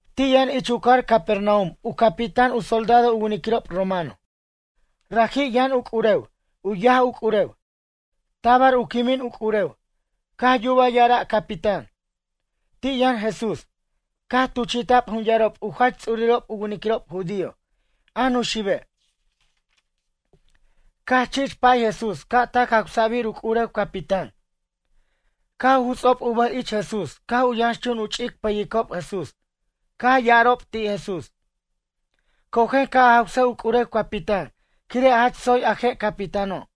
Ti' yʌn ich u cajar Capernaum u capitán u soldado u winiquirob romano. Raji' yʌn u c'urew, u yaj u c'urew, tabar u quimin u c'urew. Caj yubaj ya'ara' capitán, ti' yʌn Jesús. Caj tuchi'ta'b jun yarob u jach ts'urirob u winiquirob judío, a nuxibe', caj chich pa'ay Jesús ca' tac jawsa'bir u c'urew capitán. Caj u juts'ob u bʌj ich Jesús caj u yʌnxchun u chich pʌyicob Jesús, caj ya'arob ti' Jesús: ―Cojen ca' a jawsej u c'urew capitán quire' jach tsoy a je' capitáno'.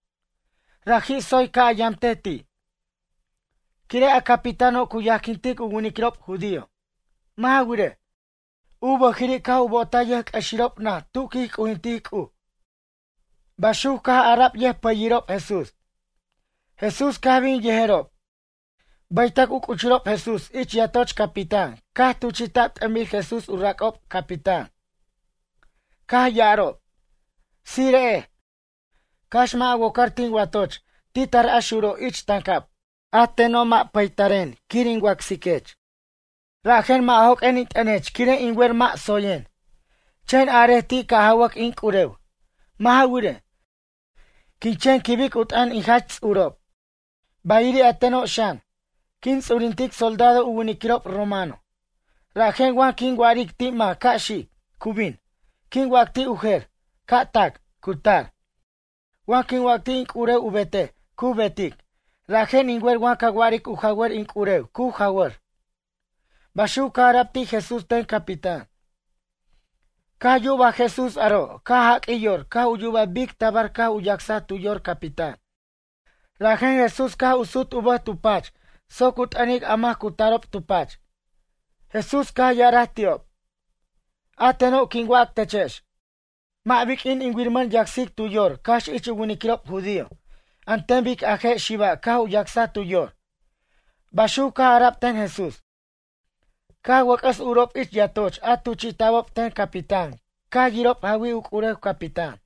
Raji' tsoy ca' a yamtej ti'. Quire' a capitáno' cu yajquintic u winiquirob judío. Mʌ' ja wirej, u bʌjiri' caj u bo'otaj yʌjc'ʌxirob naj tu quij c'ujintic C'uj ―baxuc caj ara'b yʌjpʌyirob Jesús. Jesús caj bin yejerob. Bʌytʌc u c'uchurob Jesús ich yatoch capitán caj tuchi'ta'b t'ʌnbir Jesús u rac'ob capitán. Caj ya'arob: ―Tsire'ej, cax mʌ' a wocar tin watoch ti tar a xuro' ich tancab. A teno' mʌ' pataren quir in wacsiquech. Rajen mʌ' joq'uen in t'ʌnech quire' in wer mʌ' tsoyen. Chen arej ti' ca' jawac in c'urew. Mʌ' ja wirej, quin chen quibic u t'ʌn in jach ts'urob. Bayiri' a teno' xan, quin ts'urintic soldado u winiquirob romano. Rajen wa quin wa'aric ti' mac ca' xic, cu bin. Quin wac ti' u jer, ca' tac, cu tar. Wa quin wac ti' in c'urew u betej, cu betic. Rajen in wer wa ca waric u jawʌr in c'urew cu jawʌr ―baxuc caj ara'b ti' Jesús ten capitán. Caj yuba Jesús aro' caj jaq'uij yor caj yuba bic tabar caj u yacsaj tu yor capitán. Rajen Jesús caj u sut u bʌj tu pach soc u t'ʌnic a mac a cu tarob tu pach. Jesús caj ya'araj ti'ob: ―A teno' quin wac techex, mʌ' biq'uin in wiramʌn yacsic tu yor cax ich u winiquirob judío, an ten bic a je' xiba' caj u yacsaj tu yor ―baxuc caj ara'b ten Jesús. Caj wʌc'ʌs urob ich yatoch a tuchi'ta'bob ten capitán caj yirob jawij u c'urew capitán.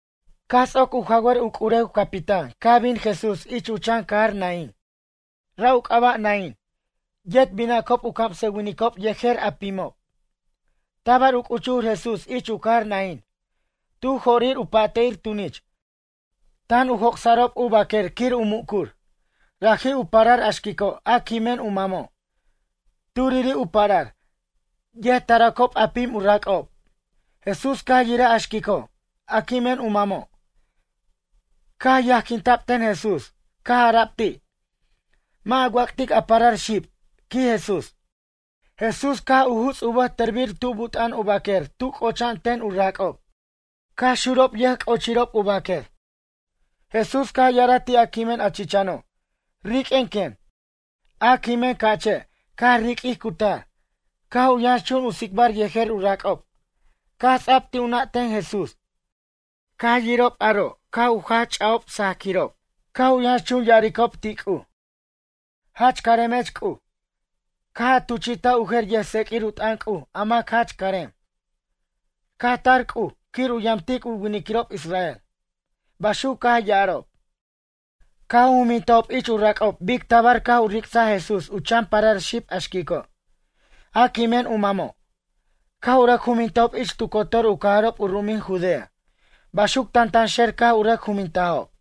Caj ts'oc u jawsa'r u c'urew capitán caj bin Jesús ich u chan cajar Naín. Ra' u c'aba' Naín. Yet binacob u camsʌwinicob yejer a pimob. Tabar u c'uchur Jesús ich u cajar Naín, tu jo'rir u pa'te'ir tunich, tan u joc'sa'rob u baquer quir u mucur. Raji' u parar a xquico', a quimen u mamo'. Turiri' u parar. Yet taracob a pim u rac'ob. Jesús caj yiraj a xquico', a quimen u mamo', caj yajquinta'b ten Jesús. Caj ara'b ti': ―Mʌ' a wac'tic a parar xib ―quij Jesús. Jesús caj u juts' u bʌj tʌrbir tu but'a'an u baquer tu c'ocha'an ten u rac'ob. Caj xurob yʌjc'ochirob u baquer. Jesús caj ya'araj ti' a quimen a chichano': ―Riq'uen, quen. A quimen ca'che' caj riq'uij cutar, caj u yʌnxchun u tsicbar yejer u rac'ob. Caj ts'a'b ti' u nʌ' ten Jesús. Caj yirob aro' caj u jach ch'ajob sajaquirob, caj u yʌnxchun ya'aricob ti' C'uj: ―Jach caremech C'uj. Caj a tuchi'taj u jer yʌjtseq'uir u t'ʌn C'uj a mac jach carem. Caj tar C'uj quir u yamtic u winiquirob israel ―baxuc caj ya'arob. Caj u jumintajob ich u rac'ob bic tabar caj u ric'saj Jesús u chan parar xib a xquico', a quimen u mamo'. Caj u rʌc jumintajob ich tu cotor u cajarob u ru'umin Judea. Baxuc tantanxer caj u rʌc jumintajob.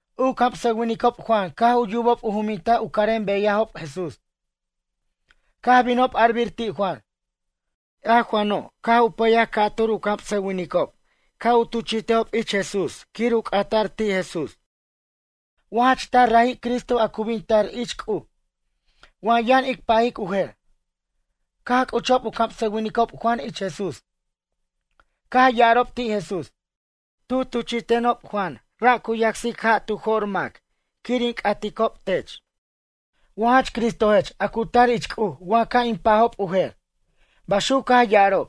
U camsʌwinicob Juan caj u yubob u juminta' u carem beyajob Jesús. Caj binob arbir ti' Juan. A Juano' caj u pʌyaj ca'tur u camsʌwinicob ca' u tuchi'tejob ich Jesús quir u c'ata'r ti' Jesús: ―Wa jach taj raji' Cristo a cu bin tar ich C'uj? Wa yʌn ic pajic u jer? Caj c'uchob u camsʌwinicob Juan ich Jesús. Caj ya'arob ti' Jesús: ―Tu tuchi'tenob Juan ra' cu yacsic ja' tu jo'r mac quir in c'atob tech. Wa jach Cristojech a cu tar ich C'uj wa ca' in pajob u jer? ―baxuc caj ya'arob.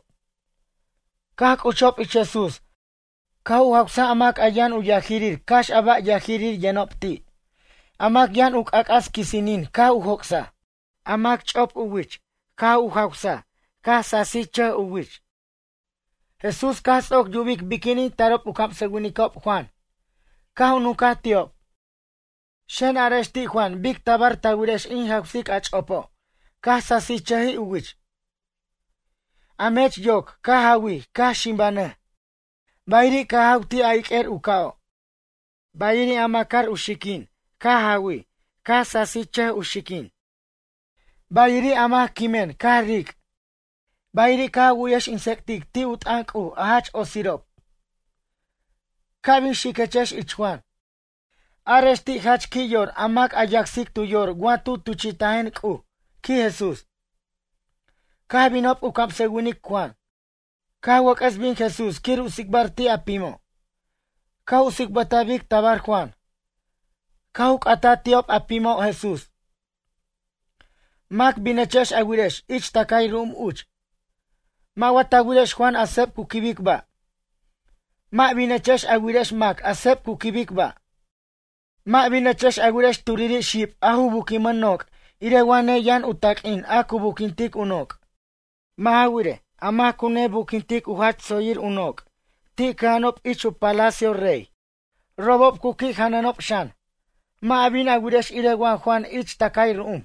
Caj c'uchob ich Jesús caj u jawsaj a mac yʌn u yajirir cax a bar yajir yʌnob ti'. A mac yʌn u c'ac'as quisinin caj u joc'saj. A mac ch'op u wich caj u jawsa caj sasichʌj u wich. Jesús caj ts'oc yubic biquinin tarob u camsʌwinicob Juan, caj u nuncaj ti'ob: ―Xen arex ti' Juan bic tabar ta wirex in jawsic a ch'opo' caj sasichʌj u wich, a mech yoc caj jawij caj ximbajnʌj. Bayiri' caj jaw ti' a iq'uir u ca'o'. Bayiri' a macar u xiquin caj jawi caj sasichʌj u xiquin. Bayiri' a mac quimen caj ric'. Bayiri' caj a wu'yex in tsec'tic ti' u t'ʌn C'uj a jach otsirob. Ca' bin xiquechex ich Juan: Arex ti' jach qui' yor a mac a yacsic tu yor wa tu tuchi'tajen C'uj ―quij Jesús. Caj binob u camsʌwinic Juan. Caj wʌc'ʌs bin Jesús quir u tsicbar ti' a pimo'. Caj u tsicbʌtaj bic tabar Juan. Caj u c'ataj ti'ob a pimo' Jesús: ―Mac binechex a wirex ich tʌcay ru'um uch? Mʌ' wa ta wirex Juan a seb cu quibic ba'? Mʌ' binechex a wirex mac a seb cu quibic ba'. Mʌ' binechex a wirex turiri' xib a ju buquimʌn noc' irej wa neyʌn u taq'uin a cu buquintic u noc'. Mʌ' ja wirej, a mac cu nebuquintic u jach tsoyir u noc' ti' cʌja'anob ich u palacio rey. Robob cu qui' janʌnob xan. Mʌ' a bin a wirex irej wa Juan ich tʌcay ru'um.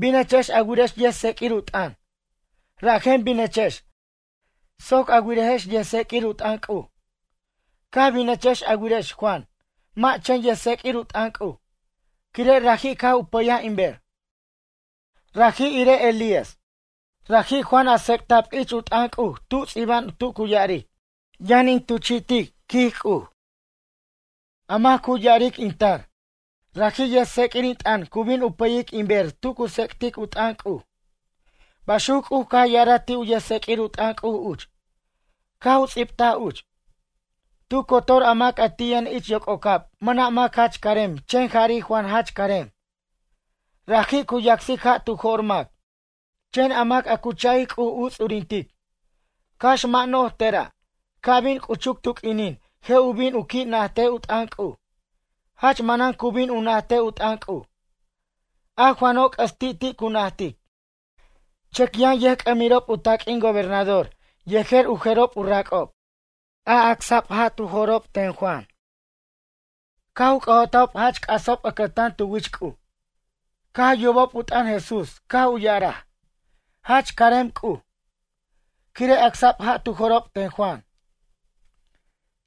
Binechex a wirex yʌjtseq'uir u t'ʌn. Rajen binechex soc a wirejex yʌjtseq'uir u t'ʌn C'uj. Caj binechex a wirex Juan mʌ' chen yʌjtseq'uir u t'ʌn C'uj, quire' raji' caj u payaj in ber. Raji' irej Elías. Raji' Juan a tsec'ta'b ich u t'ʌn C'uj tu ts'iba'an tu cu ya'aric: Yʌn in tuchi'tic, quij C'uj, a mac cu ya'aric in tar, raji' yʌjtseq'uir in t'ʌn cu bin u pʌyic in ber tu cu tsec'tic u t'ʌn C'uj. Baxuc C'uj caj ya'araj ti' u yʌjtseq'uir u t'ʌn C'uj uch, caj u ts'ibtaj uch. Tu cotor a mac ti' yʌn ich yoc'ocab mʌna' mac jach carem chen jari' Juan jach carem. Raji' cu yacsic ja' tu jo'r mac. Chen a mac a cu cha'ic C'uj u ts'urintic, cax mʌ' no'j tera', ca' bin u c'uchuc tu q'uinin je' u bin u qui' najtej u t'ʌn C'uj. Jach manan cu bin u najtej u t'ʌn C'uj. A Juano' c'ʌs ti' ti' cu najtic. Chʌc yʌn yʌjc'amirob u taq'uin gobernador yejer u jerob u rac'ob, a yacsa'b ja' tu jo'rob ten Juan, caj u c'ʌ'otajob jach c'asob ʌcʌtan tu wich C'uj. Caj yubob u t'ʌn Jesús caj u ya'araj: ―Jach carem C'uj. Quire' acsa'b ja' tu jo'rob ten Juan.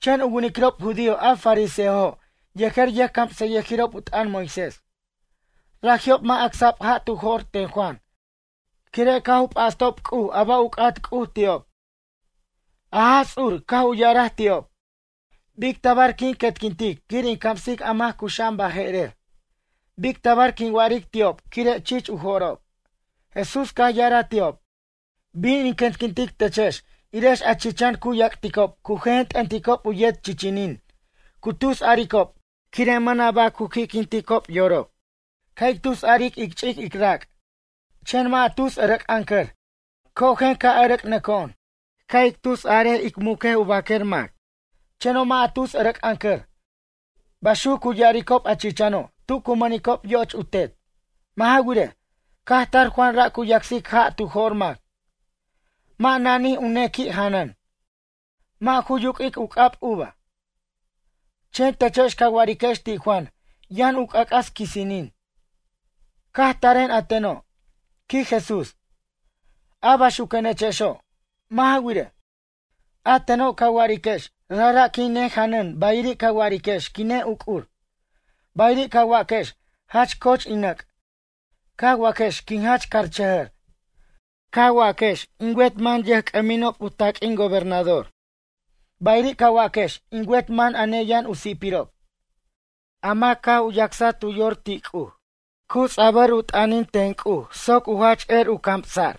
Chen u winiquirob judío a fariseojo' yejer yʌjcamsʌyʌjirob u t'ʌn Moisés, raji'ob mʌ' acsa'b ja' tu jo'r ten Juan quire' caj u p'astob C'uj a ba' u c'at C'uj ti'ob. A Jaj Ts'ur caj u ya'araj ti'ob: ―Bic tabar quin quetquintic quir in camsic a mac cuxa'an baje'rer? Bic tabar quin wa'aric ti'ob quire' chich u jo'rob? Jesús caj ya'araj ti'ob: ―Bin in quetquintic techex irex a chichan cu yac'ticob cu jenjen t'ʌnticob u yet chichinin cu tus aricob quire' mʌna' ba' cu qui'quinticob yorob: “Ca' ic tus aric ic ch'ic ic rac'. Chen mʌ' a tus ʌrʌc'ʌncʌr Cojen ca' ʌrʌc'nʌco'on. Ca' ic tus arej ic muc u baquer mac. Cheno' mʌ' a tus ʌrʌc'ʌncʌr”, baxuc cu ya'aricob a chicano' tu cu mʌnicob yoch u tet. Mʌ' ja wirej, caj tar Juan ra' cu yacsic ja' tu jo'r mac, mʌ' nanij u nequi' janʌn, mʌ' ju yuq'uic u c'ab uva. Chen techex ca wa'ariquex ti' Juan yʌn u c'ac'as quisinin. Caj taren a teno' ―quij Jesús―, a baxuquenechexo'. Mʌ' wirej, a teno' ca wa'ariquex rajra' quin nejanʌn bayiri' ca wa'ariquex quin ne uc'ur. Bayiri' ca waquex jach coch in nʌc' ca waquex quin jach carchʌjʌr. Ca waquex in wet man yʌjc'ʌminob u taq'uin gobernador. Bayiri' ca waquex in wet man a neyʌn u si'pirob. A mac caj u yacsaj tu yor ti' C'uj. Cu ts'abʌr u t'ʌnin ten C'uj soc u jach er u camsa'r.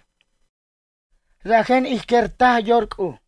Rajen ij quer taj yor C'uj.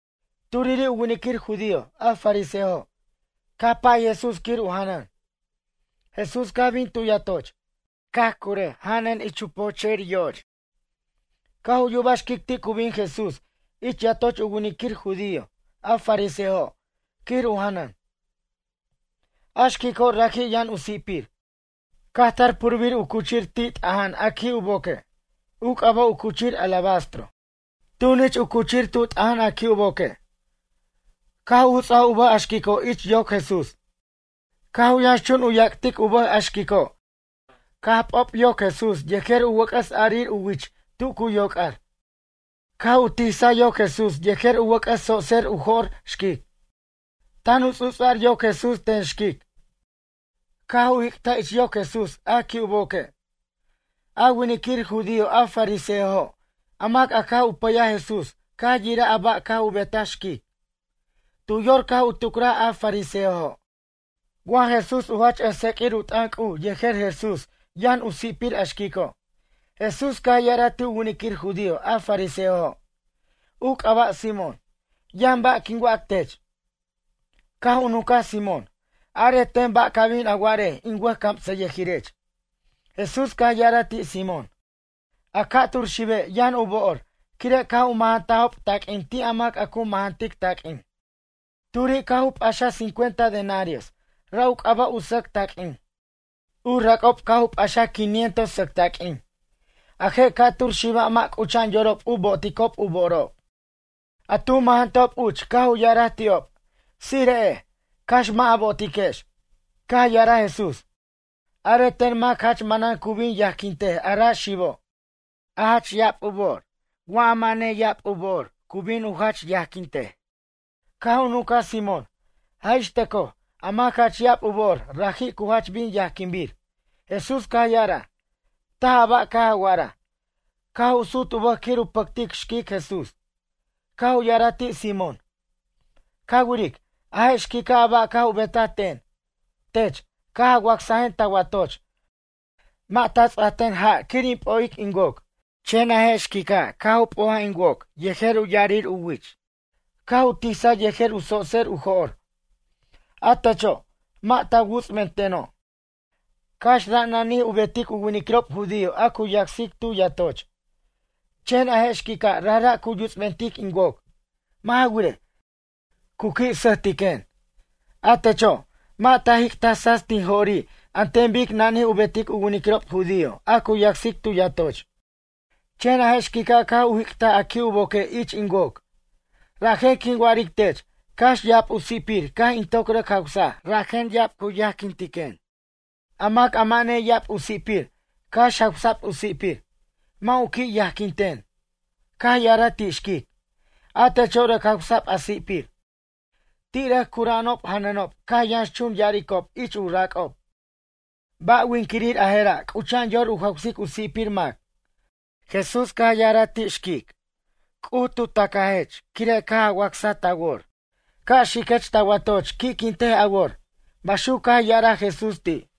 Turiri' u winiquir judío a fariseojo' caj pa'ay Jesús quir u janʌn. Jesús caj bin tu yatoch. Caj curaj janʌn ich u poche'ir yo'och. Caj u yubaj xquic ti' cu bin Jesús ich yatoch u winiquir judío a fariseojo' quir u janʌn. A xquico' raji' yʌn u si'pir. Caj tar purbir u cuchir ti' t'aja'an a qui' u boque'. U c'aba' u cuchir alabastro. Tunich u cuchir tu t'aja'an a qui' u boque'. Caj u juts'a u bʌj a xquico' ich yoc Jesús. Caj u yʌnxchun u yac'tic u bʌj a xquico' caj p'ob yoc Jesús yejer u wʌc'ʌs arir u wich tu cu yoc'ar. Caj u tisa yoc Jesús yejer u wʌc'ʌs tsotser u jo'r xquic. Tan u ts'u'ts'ar yoc Jesús ten xquic. Caj u jic'taj ich yoc Jesús a qui' u boque'. A winiquir judío a fariseojo' a mac caj u pʌyaj Jesús caj yiraj a ba' caj u betaj xquic. Tu yor caj u tucraj a fariseojo': “Wa Jesús u jach ʌjtseq'uir u t'ʌn C'uj yer Jesús yʌn u si'pir a xquico'.” Jesús caj ya'araj ti' u winiquir judío a fariseojo', u c'aba' Simón: ―Yʌn ba' quin wac tech. Caj u nunca Simón: ―Arej ten ba' ca bin a wa'arej in wʌjcamsʌyʌjirech. Jesús caj ya'araj ti' Simón: ―A ca'tur xibe' yʌn u bo'or quire' caj u mʌjʌntajob taq'uin ti' a mac cu mʌjʌntic taq'uin. Turi' caj u p'axaj cincuenta denarios, ra' u c'aba' u sʌc taq'uin. U rac'ob caj u p'axaj quinientos sʌc taq'uin. A je' ca'tur xiba' mʌ' c'ucha'an yorob u bo'oticob u bo'orob. A tu mʌjʌntajob uch caj u ya'araj ti'ob: “Tsire'ej, cax mʌ' a bo'otiquex.” Caj ya'araj Jesús: ―Arej ten mac jach manan cu bin yajquintej a ra' xibo'. A jach ya'ab u bo'or wa ja mʌ' neya'ab u bo'or cu bin u jach yajquintej? Caj u nuncaj Simón: ―Jaj ixtʌcoj, a mac jach ya'ab u bo'or, raji' cu jach bin yajquinbir. Jesús caj ya'araj: ―Taj a ba' caj a wa'araj. Caj u sut u bʌj quir u pʌctic xquic Jesús. Caj u ya'araj ti' Simón: ―Ca wiric, a je' xquica' a ba' caj u betaj ten. Tech, caj a wacsajen ta watoch, mʌ' ta ts'ajten ja' quir in p'o'ic in woc. Chen a je' xquica' caj u p'oj in woc yejer u ya'arir u wich. Caj u tisaj yejer u tsotser u jo'r. A techo', mʌ' ta wuts'benteno', cax ra' nanij u betic u winiquirob judío a cu yacsic tu yatoch. Chen a je' xquica' rajra' cu yuts'bentic in woc. Mʌ' ja wirej, cu qui' sʌjtiquen. A techo', mʌ' ta jic'taj tsats tin jo'ri' an ten bic nanij u betic u winiquirob judío a cu yacsic tu yatoch. Chen a je' xquica' caj u jic'taj a qui' u boque' ich in woc. Rajen quin wa'aric tech cax ya'ab u si'pir caj in toc rʌc jawsaj rajen ya'ab cu yajquintiquen. A mac a mʌ' neya'ab u si'pir cax jawsa'b u si'pir, mʌ' u qui' yajquinten. Caj ya'araj ti' xquic: ―A techo' rʌc jawsa'b a si'pir. Ti' rʌc cura'anob janʌnob caj yʌnxchun ya'aricob ich u rac'ob: ―Ba' winquirir a je'ra' c'ucha'an yor u jawsic u si'pir mac? Caj ya'araj ti' xquic Jesús: ―C'uj bin u tacajech quire' caj a wacsaj ta wor. Ca' xiquech ta watoch qui'quintej a wor ―baxuc caj ya'araj Jesús ti'.